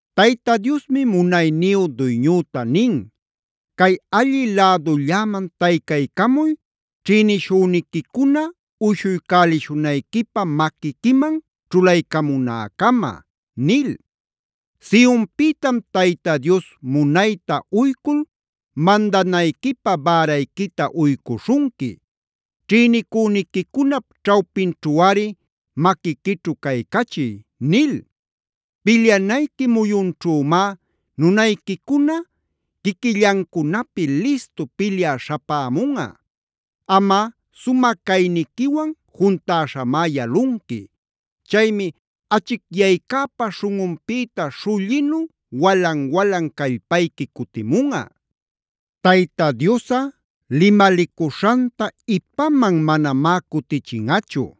Tayta Diosmi munayniyu Duyñüta nin: “Cay allï lädulläman taycaycamuy ćhïnishüniquicuna uyshuycälishunayquipä maquiquiman ćhulaycamunäcama”a nil. Sionpïtam Tayta Dios munayta uycul mandanayquipä bärayquita uycuśhunqui: “Ćhïnicüniquicunap ćhawpinćhuꞌari maquiquićhu caycachiy” nil. Pilyanayqui muyunćhümá nunayquicuna, quiquillancunapi listu pilyä śhapämunꞌa. Amꞌa sumä cayniquiwan juntäśhamá yalunqui. Chaymi achicyaycäpa śhunꞌunpïta śhullinu walan-walan callpayqui cutimunꞌa. Tayta Diosꞌa limalicuśhanta ipaman manamá cutichinꞌachu: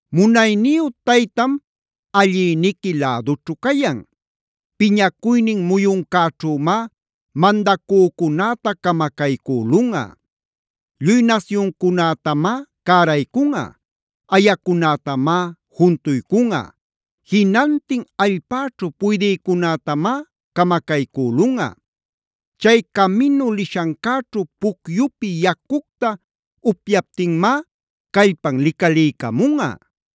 Munayniyu Taytam allïniqui lädućhu cayan. Piñacuynin muyuncäćhümá mandacücunäta camacaycülunꞌa. Lluy nasyuncunätamá cäraycunꞌa, ayacunätamác juntuycunꞌa, jinantin allpäćhu puydïcunätamá camacaycülunꞌa. Chay caminu lishancäćhu pucyupi yacucta upyaptinmá callpan licaliycamunꞌa.